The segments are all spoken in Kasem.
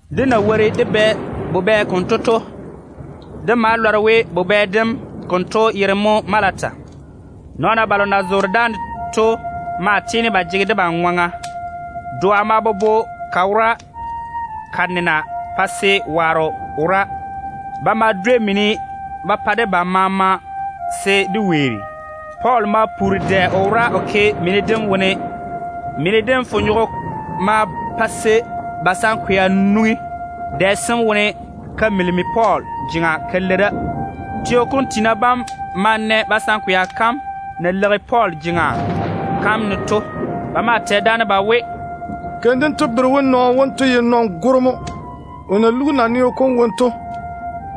Dé na wori dé bɛ bubɛ konto to, dé ma lɔre we bubɛ dem konto yere mo Maleta. Nɔɔna balo na zoore dáane to maa tiini ba jege debam ŋwaŋa. Doa maa bobo ka wora ka nena pa se waaro wora. Ba ma dwei mini ba pa debam maama se dé weeri. Pɔɔl ma puuri dɛ o wora o ke mini dem wone. Mini dem fonyogo ma pa se basankwea nwoŋi dɛ sem wone ka kekare Pɔɔl jeŋa ka lei da. Teo kom tiina bam ma na basankwea kam na leigi Pɔɔl jeŋa kam ne to. Ba maa tɛ daane ba we, “Keim dento bere we nɔɔno wonto ye nɔn-goro mo. O na lugi naneo kom wone to,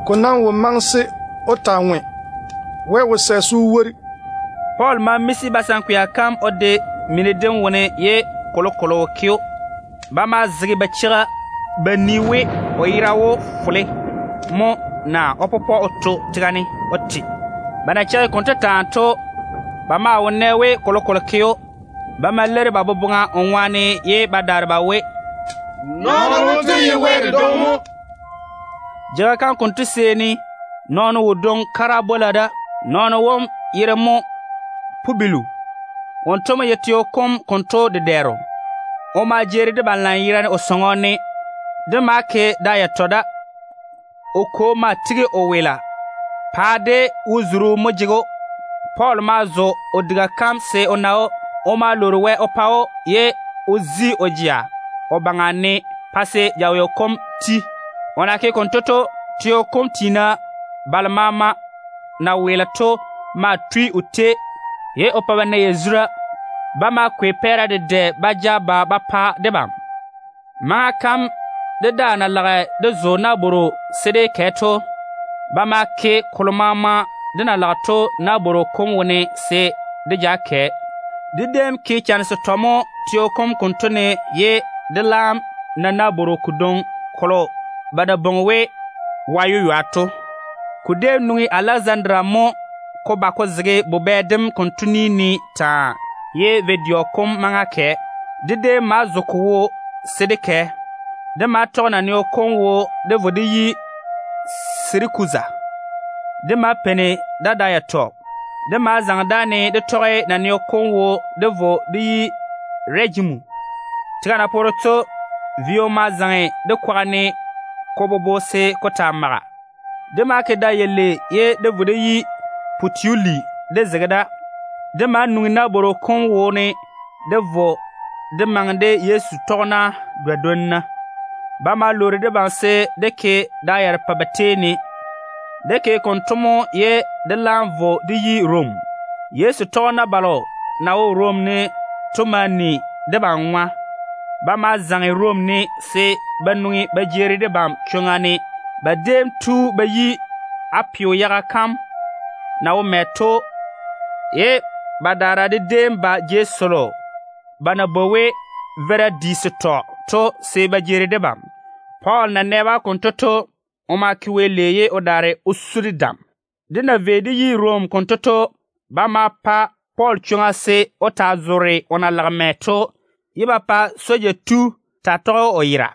ko nam wo maŋe se o taa ŋwe. Wɛ wo sɛ se o wori.” Pɔɔl ma miisi basankwea kam o de mini dem wone ye kolokolo wo ke‑o. Ba maa zege ba cheigi ba nii se o yera ga wó fole mo naa o pɔpɔ o to tega ne o te. Ba na cheigi konto taa to, ba maa wo nɛ we kolokolo ke‑o. Ba ma leiri ba boboŋa o ŋwaane ye ba daare ba we, “Nɔɔno wonto ye wɛ dedwoŋi mo!” Jeiga kam konto seeni nɔɔno wodwoŋi kara bwola da. Nɔɔno wom yere mo Pubilu. Wonto mo ye teo kom konto dedɛɛro. O ma jeeri debam lanyerane o sɔŋɔ ne. Dé ma ke da yatɔ da. O kwo maa tigi o weela. Paa de wo-zuru mo jege‑o. Pɔɔl ma zo o diga kam se o na‑o. O ma lwoori Wɛ o pa‑o, ye o zi o jea o baŋa ne pa se jaweo kom jei. O na ke konto to, teo kom tiina balo maama na weele to maa tui o tei ye o pa ba na yazura. Ba ma kwei pɛɛra dedɛ ba ja ba ba pa debam. Maŋa kalo dé daa na lage dé zo nabworo se dé kɛ to, ba ma ke kolo maama dé na lage to nabworo kom wone se dé ja kɛ. Dé déem ke chane setɔ mo teo kom konto ne ye dé laam na nabworo kodwoŋi kolo ba na bwoŋi we ‘Wa-yeywa’ to. Ko déem nwoŋi Alɛzandaria mo ko ba ko zege bubɛ dem konto ni ne taa ye vo-dɛɔ kom maŋa kɛ. Dé déem ma zo ko wo se dé kɛ. Dé ma tɔge naneo kom wo dé vo dé yi Sirakuza. Dé ma peini da da yatɔ. Dé ma zaŋe dáane dé tɔge naneo kom wo dé vo dé yi Rɛgimu. Tega na poore to, vio ma zaŋe dé kwaga ne ko bobo se ko taa maga. Dé ma ke da yalei ye dé vo dé yi Putioli dé zege da. Dé ma nwoŋi nabworo kom wone dé vo dé maŋe de Yezu tɔgena badwonna. Ba ma lwoori debam se dé ke da yarepɛ ba tei ne. Dé ke konto mo ye dé laam vo dé yi Rom. Yezu tɔgena balo na wo Rom ne to ma ni debam ŋwa. Ba ma zaŋe Rom ne se ba nwoŋi ba jeeri debam chwoŋa ne. Ba déem tu ba yi Apiu yaga kam na wo mɛ to, ye badaara de déem ba jei selo ba na bwoi we ‘Veira Di Setɔ’ to se ba jeeri debam. Pɔɔl na nɛ-ba konto to, o ma ke Wɛ lei ye o daare o su de dam. Dé na vei dé yi Rom konto to, ba ma pa Pɔɔl chwoŋa se o taa zoore o na lage mɛ to, ye ba pa soja tu taa tɔge‑o o yera.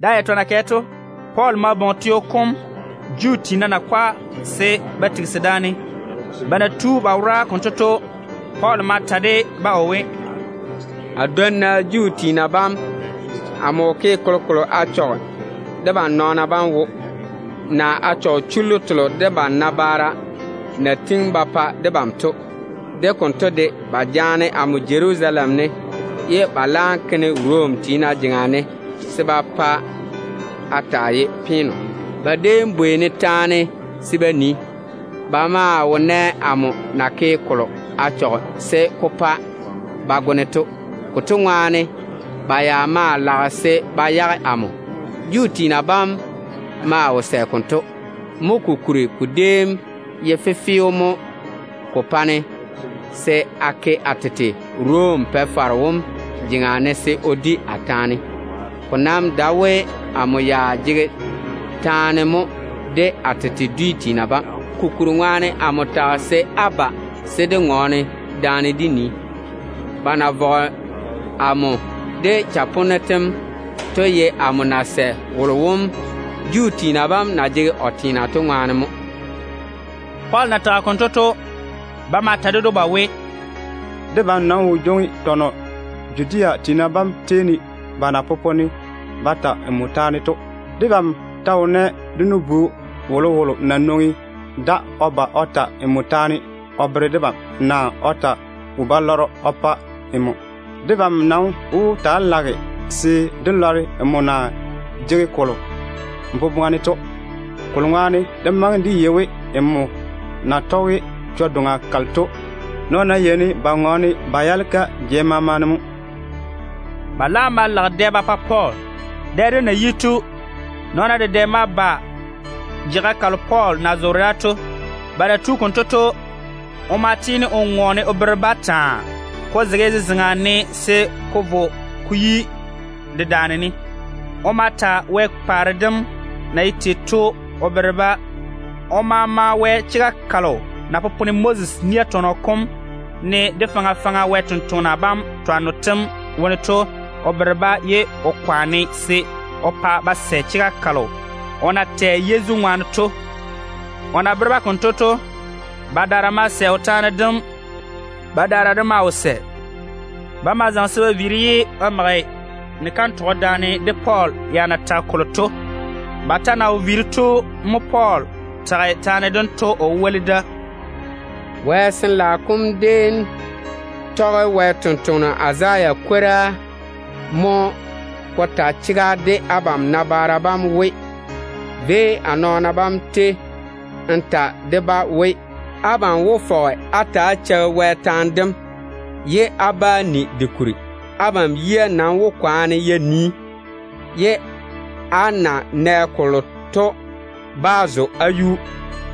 Da yatɔ na kɛ to, Pɔɔl ma bwoŋi teo kom Juu tiina nakwa se ba tigisi daane. Ba na tu ba wora konto to, Pɔɔl ma ta de-ba o we, “A nu-bia bam, amo wo ke kolokolo a chɔge debam nɔɔna bam wo, naa a chɔge chullu telo dé nabaara bam na tiŋi ba pa debam to. De konto de, ba jaane amo Jerusalem ne ye ba laam ke-ne Rom tiina jeŋa ne se a taa ye peeno. Ba déem bwei-ne taane se ba nii. Ba maa wo nɛ amo na ke kolo a chɔge se ko pa ba go-ne to. Konto ŋwaane ba ya maa lage se ba yage amo. Juu tiina bam maa wo sɛ konto. Mo kokuri ko déem ye fefeo mo ko pa-ne se a ke a tete Rom Pa-faro wom jeŋa ne se o di a taane. Ko nam dae we amo ya jege taane mo de a tete dwi tiina bam. Konto ŋwaane mo amo bwoŋi abam se á ba se dé ŋɔɔne daane dé nii. Ba na vɔge amo de chaponno tem to, ko ye amo na sɛ wolo wom Juu tiina bam na jege o teena to ŋwaane mo.” Pɔɔl na tage konto to, ba ma ta ded‑o ba we, “Debam nam wo jwoŋi tɔnɔ Judea tiina bam tei ne ba na popone ba ta nmo taane to. Debam ta wo nɛ dé nu-bu wolowolo na nwoŋi da o ba o ta nmo taane o bere debam, naa o ta wo-balɔrɔ o pa nmo. Debam nam wó taa lage se dé lɔre nmo na jege kolo n boboŋa ne to. Kolo ŋwaane ko ná ye nmo na tɔge chwo-doŋa kalo to, dé maŋe dé yei we nɔɔna yeini ba ŋɔɔne ba yaale-ka jei maama ne mo.” Ba laam ma lage dɛ ba pa Pɔɔl. Dɛ dem na yi to, nɔɔna dedɛ ma ba jeiga kalo Pɔɔl na zoore da to. Ba na tu konto to, o ma tiini o ŋɔɔne o bere-ba taa, ko zege zezeŋa ne se ko vo ko yi dedaan-ni. O ma ta Wɛ paare dem na ye tei to o bere-ba. O ma ma Wɛ chega kalo na popone Moses nia tɔnɔ kom ne, de faŋa faŋa Wɛ sampwori sem twanno tem wone to o bere-ba, ye o kwaane se o pa ba sɛ chega kalo o na tɛ Yezu ŋwaane to. O na bere-ba konto to, badaara ma sɛ o taane dem. Badaara de maa wo sɛ. Ba ma zaŋe se ba viiri ye ba mage ni-kantɔgɔ daane Pɔɔl ya na tage kolo to baŋa ne. Ba ta na wo viiri to mo Pɔɔl tage taane dento o woli da: “Wɛ Sin-laao kom déem tɔge Wɛ sampwora Izaya kwora mo ko ta chega de abam nabaara bam we: Véi a nɔɔna bam tei n ta de-ba we: ‘Abam wó fɔge á ta‑á cheigi Wɛ taane dem, ye á bá ni de kuri. Abam yia nam wó kwaane ya nii, ye á na nɛ kolo to bá zo á yuu.’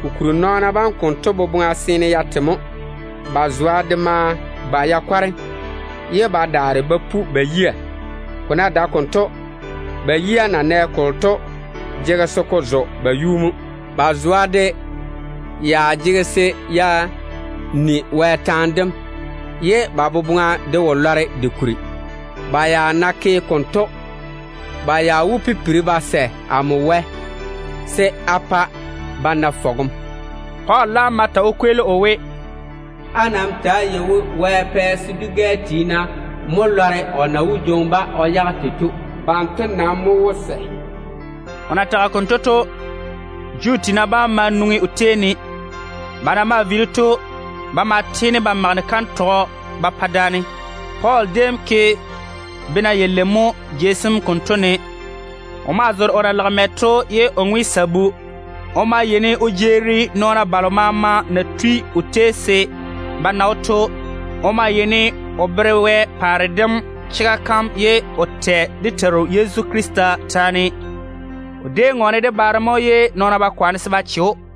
Kokuri nɔɔna bam konto boboŋa seene ya te mo. Ba zwa de ma kwareme, ye ba daare ba pu ba yia. Ko ná dae konto, ba yia na nɛ kolo to jege se ko zo ba yuu mo. Ba zwa de ya jege se ya ni Wɛ taane dem, ye ba boboŋa de wó lɔre de kuri. Ba ya ná ke konto, ba ya wó pipiri ba sɛ amo Wɛ se a pa ba na fɔgem.” Pɔɔl laam ma ta o kweeli o we, “Á nam ta‑á yei-na we Wɛ pɛ se dwi-gɛ tiina mo lɔre o na wó jwoŋi-ba o yage tei to. Banto nam mo wó sɛ.” [ O na tage konto to, Juu tiina bam ma nwoŋi o tei ne. Ba na maa viiri to, ba ma tiini ba mage ni-kantɔgɔ ba pa daane.] Pɔɔl déem ke bena yalei mo jei sem konto ne. O maa zoore o na lage mɛ to ye o ŋwe sabu. O maa yeini o jeeri nɔɔna balo maama na tui o tei se ba na‑o to. O maa yeini o bere Wɛ paare dem chega kam ye o tɔɔle dé Teiru Yezu Krista kwora. O déem ŋɔɔne de baare mo ye nɔɔn-nɔɔno wo chege o yiga.